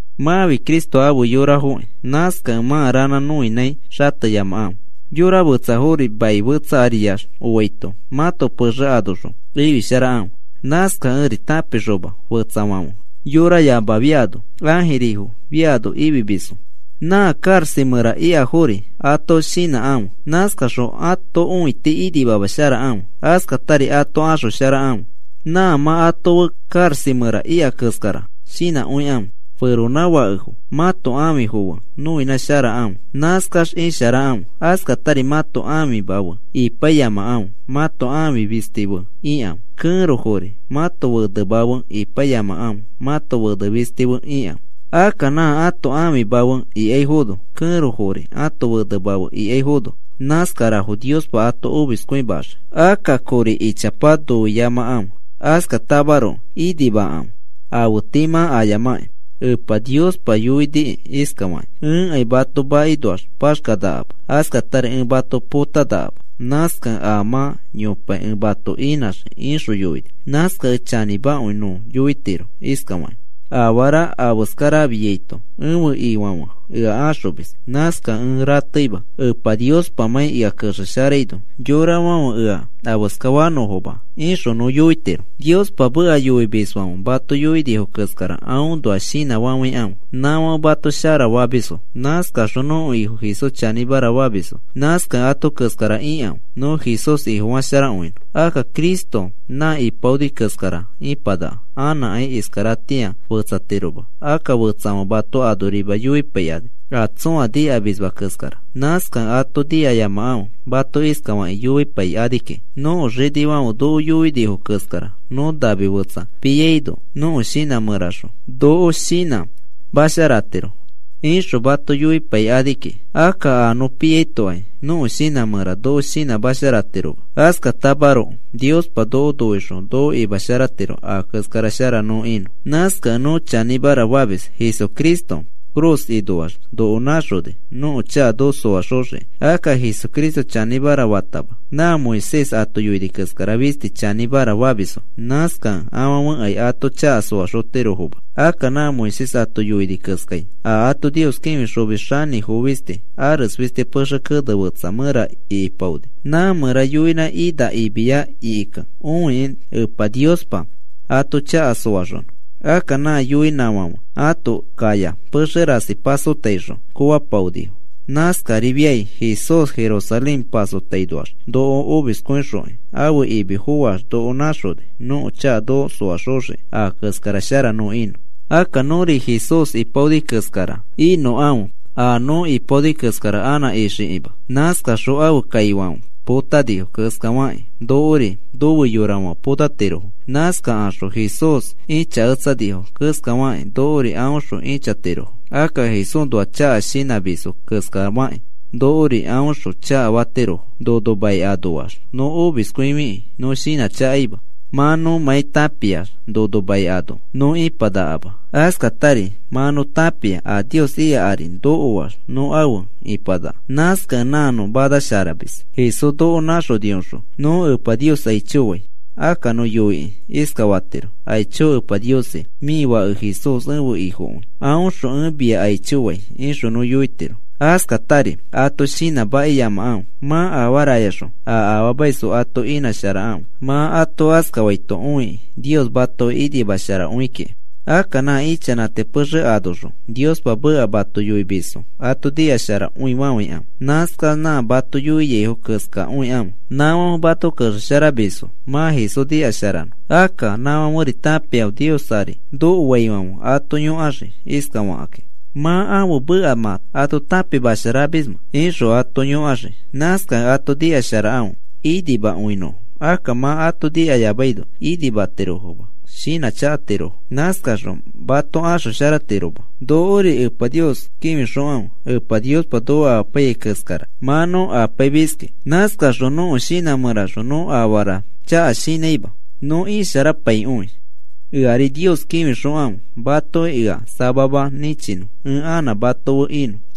Mãfi Cristo afe yorafokĩ. Nãskakẽ mã ranã nõinãi xateyamakãfe. Yora fetsafori mai fetsa ariax oaito mãto pexe anoxõ ifisharakãfe. Nãskakẽri tãpixoma fetsafãfe yorayama fiano ãjirifo fiano ifimisfo. Nã karaxa mẽra ikafori ato shinãkãfe. Nãskaxõ ato õiti inimamasharakãfe. Askatari ato axosharakãfe. Nã mã ato fe karaxa mẽra ika keskara shinãkõikãfe. Feronãfakefo, mãto ãfifo fe nõinãsharakãfe. Nãskax isharakãfe. Askatari mãto ãfima fe ipaiyamakãfe, mãto ãfi fisti fe ikãfe. Kẽrofori mãto fenema fe ipaiyamakãfe, mãto fene fisti fe ikãfe. Akka nã ãto ãfima fe ikaifono, kẽrofori ãto fenema fe ikaifono, nãskarafo Niospa ato omiskõimaxii. Akka kori ichapa noiyamakãfe. Askatamaroko inimakãfe afe tii mã ayamakĩ. Epa Niospa yoinikĩ iskafakĩ: “Ẽkai mato makinoax paxkanakama. Askatari ẽ mato potanakama. Nãskakẽ a mã yopai ẽ mato inãxii,” ixõ yoini. Nãskakẽ chanĩmakõi nõ yoitiro iskafakĩ: Afara afeskara afiaito ẽfe Ifãfe ea axomis. Nãskakẽ ẽ rateima, Epa Niospamãi ea kexesharaino yorafãfe ea afeskafanõfoma, ixõ nõ yoitiro. Niospa meka yoimisfãfe mato yoinifo keskara atoõnoa shinãfafãikãfe. Nãfãfe mato shara famisfo. Nãskakaxõ nõko Ifo Jesús chanĩmara famisfo. Nãskakẽ ato keskara ikãfe nõ Jesús Ifofasharakõinõ. Akka Jesucristo nã ipaoni keskara ĩpanaka. Anãkai iskaratĩa fetsatiroma. Akka fetsafãfe mato anorima yoipaikani, a tsõa nikamisma keskara. Nãskakẽ ato nikayamakãfe mato iskafakĩ yoipai ani kiki: “Nõko xinifãfe noko yoinifo keskara nõ nami fetsa piaino nõko shinã mẽra noko shinãmasharatiro,” ixõ mato yoipai ani kiki. Akka a nõ piaitokai nõko shinã mẽra noko shinãmasharatiroma. Askatamaroko Niospa noko noixõ noko imasharatiro a keskara shara nõ inõ. Nãskakẽ nõ chanĩmara famis Jesucristo ifi cruz ikakinoax noko nãxoni nõko chaka noko soaxoxiki. Akka Jesucristo chanĩmara fatama nã Moisés ato yoini keskara fisti chanĩmara famisfo. Nãskakẽ afãfekai ato chaka soaxotirofoma. Akka nã Moisés ato yoini keskai a ato Nios kĩfixomis xanĩfo fisti, ares fisti pexe kene fetsa mẽra ikipaoni, nã mẽra yoinã ina imiya ikikẽ õikĩ Epa Niospa ato chaka soaxonõ. Akka nã yoinãfãfe ato kaya pexe rasi pasotaixõ koofapaonifo. Nãskarifiai Jesús Jerusalén pasotainoax noko omiskõixokĩ ãfe imi foax noko nãxoni nõko chaka noko soaxoxiki a keskara shara nõ inõ. Akka nõri Jesús ipaoni keskara inõkãfe a nõ ipaoni keskara anã ixikima. Nãskaxõ ãfe kaifãfe potanifo keskafakĩ nokori nofe yorafãfe potatirofo. Nãskakaxõ Jesús ĩchaketsanifo keskafakĩ nokori aõxõ ĩchatirofo. Akka Jesúsnoa chaka shinãmisfo keskafakĩ nokori aõxõ chakafatirofo. Nono mai anoax nõ omiskõifikĩ nõ shinãchakaima, mã nõmãi tãpiax nono mai ano nõ ipanakama. Askatari mã nõ tãpia a Nios ika ari nokoax nõ afe ipanaka. Nãskakẽ nã nõ manasharamis. Jesús noko nãxonioxõ nõ Epa Nios aicho fai. Akka nõ yoikĩ iskafatiro: “Aicho Epa Niosi, mĩ Fake Jesús ẽfe Ifokõi. Aõxõ ẽ mia aicho fai,” ixõ nõ yoitiro. Askatari ato shinãmakiyamakãfe mã afarayaxõ a afaamaisfo ato inãsharakãfe. Mã ato askafaito õikĩ Nios matoki inimasharakõi kiki. Akka nã ichanãti pexe anoxõ Niospa meka mato yoimisfo ato nikasharakõifafãikãfe. Nãskax nã mato yoiaifo keskakõikãfe. Nãfãfe mato kexesharamisfo mã Jesús nikasharanõ. Akka nãfãferi tãpiafo Nios ari nokoaifãfe ato yõkaxii iskafakĩ: “¿Mã ẽfe meka mã ato tãpimasharamismẽ?” ixõ ato yõkaxii. Nãskakẽ ato nikasharakãfe inimakõinõfo. Akka mã ato nikayamaino inimatirofoma, shinãchakatirofo. Nãskaxõ mato axosharatiroma. Nokori Epa Nios kĩfixokãfe. Epa Niospa noko amapaiyai keskara mã nõ apaimiski. Nãskaxõ nõko shinã mẽraxõ nõ afaa chaka shinãima. Nõ isharapaikõi. Eari Nios kĩfixokãfe matoki ea samama nĩchinõ ẽ anã mato fe inõ.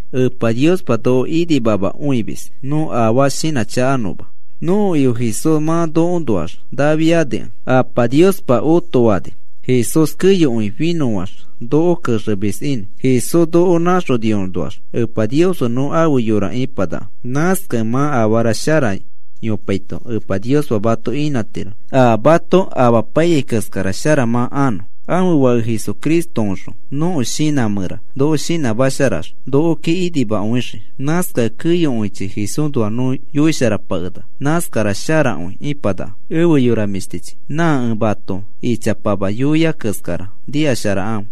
Epa Niospa noko inimamakõimis nõ afaa shinãchakanõma. Nõko Ifo Jesús mã nokoõnoax nafiakẽ Apa Niospa otofani Jesús keyokõi finõax noko kexemis inõ. Jesús noko nãxoniõnoax Epa Nios fe nõ afe yora ipanaka. Nãskakẽ mã afara shara yopaito Epa Niospa mato inãtiro a mato apaiyai keskara shara mã anõ. Ãfe Fake Jesucristoõxõ nõko shinã mẽra noko shinãmasharax nokoki inimakõixii. Nãskakẽ keyokõichi Jesúsnoa nõ yoisharapakenaka. Nãskara sharakõi ĩpanaka. Efe yora mĩshtichi, nã ẽ mato ichapama yoia keskara nikasharakãfe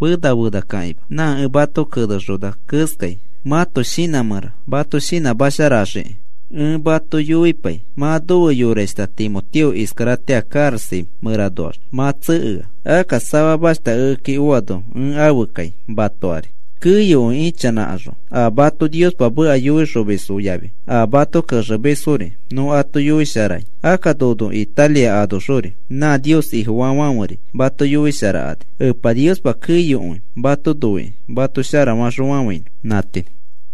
fena fenakãkima. Nã ẽ mato kenexona keskai mãto shinã mẽra mato shinãmasharaxii kiki. Ẽ mato yoipai mã nofe yorashta Timoteo iskaratĩa karaxa mẽranoax mã tsekea. Akka samamashta ekeki oano ẽ afe kai mato ari. Keyokõi ichanãkaxõ a mato Niospa meka yoixomisfo yafi a mato kexemisfori nõ ato yoisharai. Akka nono Italia anoxori nã Nios Ifofaafãferi mato yoisharakani. Epa Niospa keyokõi mato noikĩ mato shara faxõfafãinõ. Nã tii.